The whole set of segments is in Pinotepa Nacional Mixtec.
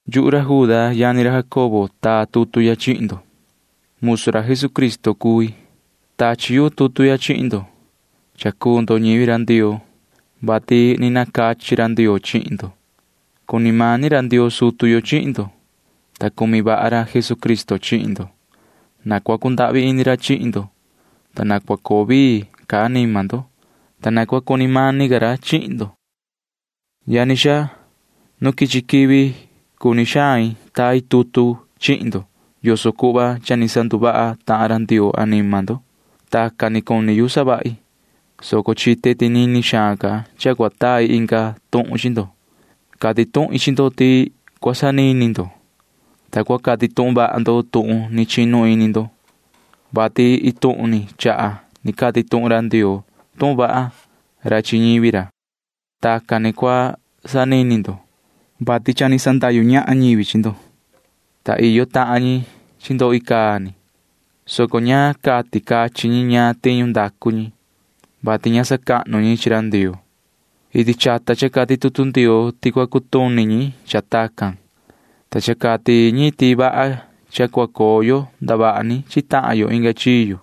Yuhu ra Juda yani ra Jacobo taa tutu ya chihin ndo. Musu ra Jesucristo cui. Tachi yu tutu ya chihin maan ndo, ta ñivi Ndioo cuu ndo, vati ni nacachi ra Ndioo chihin ndo. Cuni mani ra Ndioo sutu yo chihin ndo, ta cumi vaha ra Jesucristo chihin ndo. Na cua cundahvi ini ca ra chihin ndo, ta na cua coo vii ca anima ndo, ta na cua cuni mani ca ra chihin ndo. Yani xaa, nu quichi quivi cuni xain tai tutu chihin ndo yoso cuhva cha ni sanduvaha tahan ra Ndioo anima ndo. Tacan ni cuni yu savahi, soco quechaha chite ti nini xaan ca cua tai inga tuhun chi ndo. Cati tuhin chi ndo ti cua sanini ndo, ta cua cati tuhun vaha ndo tuhun ni chinu ini ndo, vati iin tuhun ni chaha ni cati tuhun ra Ndioo tuhun vaha ra chi ñivi ra. Tacan ni cua sanini ndo, vati cha ni sandahyu ñahan ñivi chi ndo, ta iyo tahan ñi chi ndo icaa ni, soco ña cati cachin ñi ñaan tiñu ndacu ñi, vati ña sacahnu ñi chi ra Ndioo. Iti chata cha cati tutu Ndioo ti cua cutuni ñi cha tacan, ta cha cati ñi ti vaha cha cua coo yo ndavaha ni chi tahan yo inga chiyo.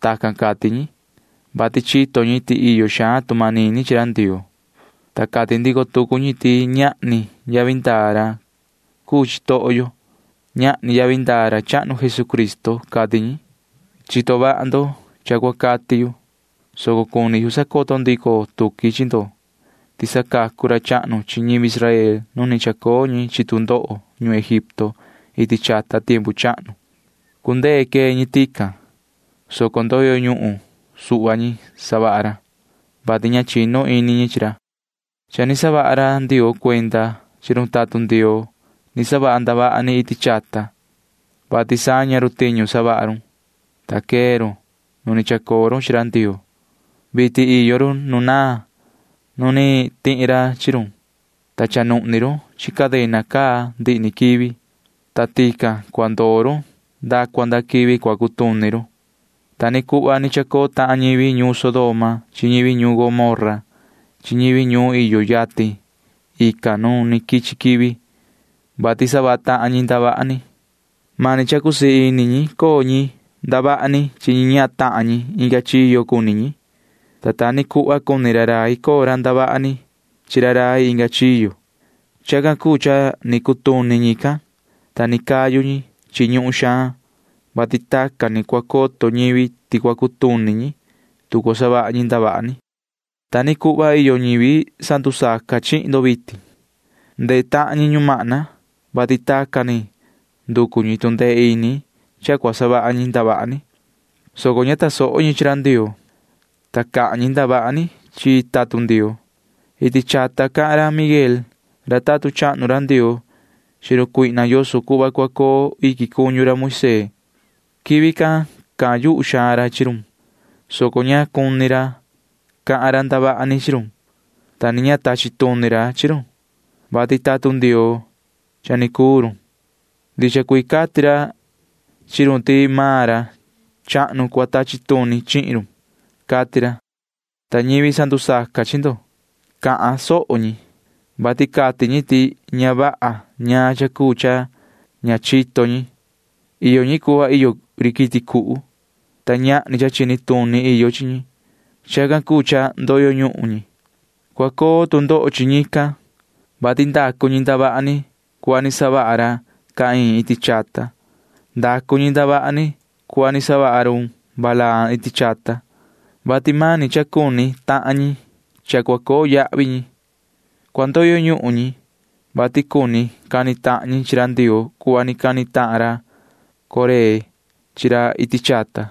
Tacan cati ñi, vati chito ñi ti iyo xaan tu manini chi ra Ndioo, ta cati ndico tucu ñi ti ñahni yavi ndaa ra cuu chitoho yo. Ñahni yavi ndaa ra chahnu Jesucristo, cati ñi. Chito vaha ndo cha cua cati yu, soco cuni yu sacoto ndico tuqui chi ndo ti sacacu ra chahnu chi ñivi Israel nu ni chacoo ñi chi tu ndoho ñuhun Egipto iti chata tiempu chahnu. Cundee quee ñi tican, soco ndoyo ñuhun suhva ñi savaha ra, vati ña chinu ini ñi chi ra. Cha ni saha ra Ndioo cuenda chi run tatun Ndioo ni savaha ndavaha ni iti chata, vati saña run tiñu savaha run, ta quee run nu ni chacoo run chi ra Ndioo. Vitin iyo run nu naan nu ni tihi ra chi run, ta cha nuhni run chi cadena caa ndihi ni quivi, ta tican cua ndoo run nda cua nda quivi cua cutuni run. Ta ni cuhva ni chacoo tahan ñivi ñuun Sodoma chi ñivi ñuun Gomorra chi ñivi iyo ñuun iyo yatin tican nu ni quichi quivi, vati savaha tahan ñi ndavaha ni. Mani cha cusii ini ñi coo ñi ñahan ndavaha ni chi ñi ñahan tahan ñi inga chiyo cuni ñi, ta ta ni cuhva cuni ra rai cusii ini ra coo ra ndavaha ni chi ra rai inga chiyo. Chacan cuu cha ni cutuni ñican, ta ni cayu ñi chi ñuhun xaan, vati tacan ni cua coto ñivi ti cua cutuni ñi, tu cua savaha ñi ndavaha ni. Ta ni cuhva iyo ñivi sandusaca chihin ndo vitin. Ndehe tahan ñi ñumahna, vati tacan ni nducu ñi tu ndee ini cha cua savaha ñi ndavaha ni, soco ña tasoho ñi chi ra Ndioo, ta cahan ñi ndavaha ni chi tatun Ndioo. Iti chata cahan ra Miguel ra tatun chahnu ra Ndioo chi run cuihna yoso cuhva cua coo iquin cuñu ra Moisee. Quivi can cahan yuhu xaan ra chi run, soco ña cuni ra cahan ra ndavaha ni chi run, ta ni ña tachi tuni ra chi run, vati tatun Ndioo cha ni cuu run. Ndicha cuii cati ra chi run ti maan ra chahnu cua tachi tuni chihin run, cati ra, ta ñivi sandusaca chi ndo―cahan soho ñi, vati cati ñi ti ña vaha ñaan cha cuu cha ña chito ñi. Iyo ñi cuhva iyo ri quiti cuhu, ta ñahni cha chini tuni iyo chi ñi. Chacan cuu cha ndoyo ñuhun ñi. Cua coo tu ndoho chi ñican, vati ndacu ñi ndavaha ni cuhva ni savaha ra Caín iti chata. Ndacu ñi ndavaha ni cuhva ni savaha ra Balaam iti chata, vati mani cha cuni tahan ñi cha cua coo yahvi ñi. Cua ndoyo ñuhun ñi, vati cuni cani tahan ñi chi ra Ndioo cuhva ni cani tahan ra Coré chi ra iti chata.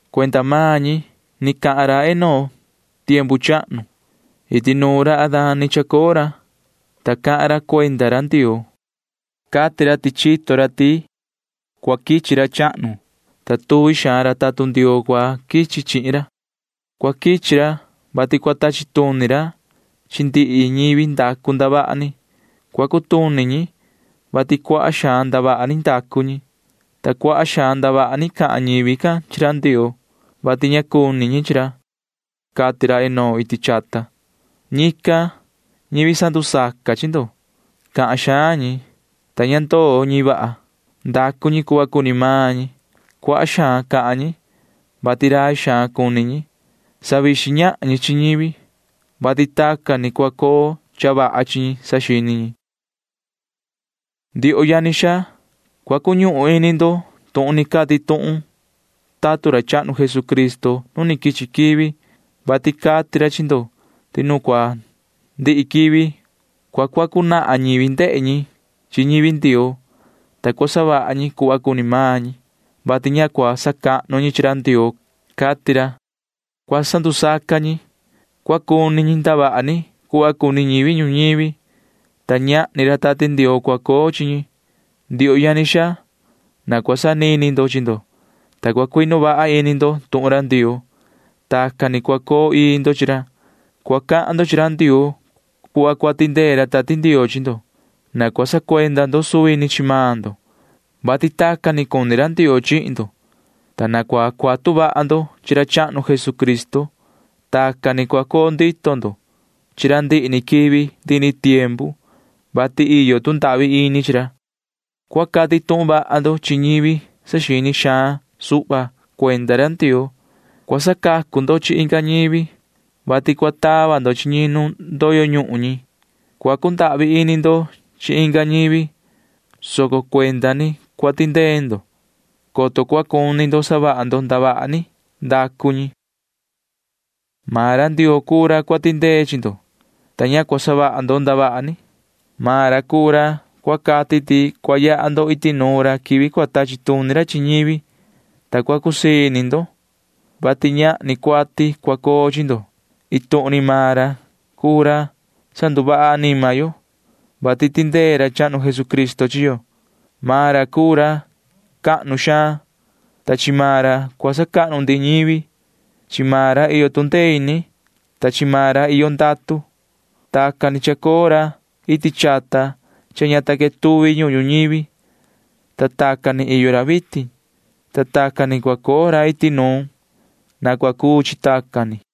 Cuenda maan ñi ni cahan ra Enoc tiempu chahnu. Iti nuun ra Adán ni chacoo ra, ta cahan ra cuenda ra Ndioo. Cati ra ti chito ra ti cua quichi ra chahnu, ta tuvi xaan ra tatun Ndioo cua quichi chihin ra. Cua quichi ra, vati cua tachi tuni ra chi ndihi ñivi ndacu ndavaha ni. Cua cutuni ñi, vati cuaha xaan ndavaha ni ndacu ñi, ta cuaha xaan ndavaha ni cahan ñivi can chi ra Ndioo, vati ña cuni ñi chi ra, cati ra Enoc iti chata. Ñican, ñivi sandusaca chi ndo―cahan xaan ñi, ta ña ndoo ñi vaha. Ndacu ñi cuhva cuni maan ñi. Cuaha xaan cahan ñi, vati rai xaan cuni ñi. Savixin ñahan ñi chi ñivi, vati tacan ni cua coo cha vaha chi ñi, saxini ñi. Ndioho yani xaa, cua cuñuhun ini ndo tuhun ni cati tuhun tatun ra chahnu Jesucristo nu quichi quivi, vati cati ra chi ndo ti nu cua ndihi quivi ya cua sacateni ñivi chi ñivi Ndioo, ta cua savaha ñi cuhva cuni maan ñi, vati ña cua sacahnu ñi chi ra Ndioo, cati ra. Cua sandusaca ñi. Cua cuni ñi ndavaha ni cuhva cuni ñivi ñuñivi, ta ñahni ra Tati Ndioo cua coo chi ñi. Ndioho yani xaa, na cua sanini ndo chi ndo, ta cua cuinu vaha ini ndo tuhun ra Ndioo. Tacan ni cua coo ii ndo chi ra. Cua cahan ndo chi ra Ndioo cuhva cua tindee ra Tati Ndioo chi ndo. Na cua sacuenda ndo suvi ni chi maan ndo, vati tacan ni cuni ra Ndioo chihin ndo, ta na cua cuatu vaha ndo chi ra chahnu Jesucristo. Tacan ni cua coo ndito ndo chi ra ndihi ni quivi ndihi ni tiempu, vati iyo tu ndahvi ini chi ra. Cua cati tuhun vaha ndo chi ñivi saxini xaan suhva cuenda ra Ndioo. Cua sacacu ndo chi inga ñivi, vati cua tava ndo chi ñi nu cua ndoyo ñuhun ñi. Cua cundahvi ini ndo chi inga ñivi, soco cuenda ni cua tindee ndo, coto cua saxini ndo ti vaha xaan iyo ndavaha ni ndacu ñi. Maan ra Ndioo cuu ra cua tindee chi ndo, ta ña cua savaha ndo ndavaha ni. Maan ra cuu ra cua cati ti cua yaha ndo iti nuun ra quivi cua tachi tuni ra chi ñivi, ta cua cusii ini ndo, vati ñahni cuati cua coo chi ndo. Iin tuhun ni maan ra cuu ra sanduvaha anima yo, vati tindee ra chahnu Jesucristo chi yo. Maan ra cuu ra cahnu xaan, ta chi maan ra cua sacahnu ndihi ñivi. Chi maan ra iyo tu ndee ini, ta chi maan ra iyo ndatu. Tacan ni chacoo ra iti chata cha ña ta quetuvi ñuhun ñuñivi, ta tacan ni iyo ra vitin, ta tacan ni cua coo ra iti nuun. Na cua cuu chi tacan ni.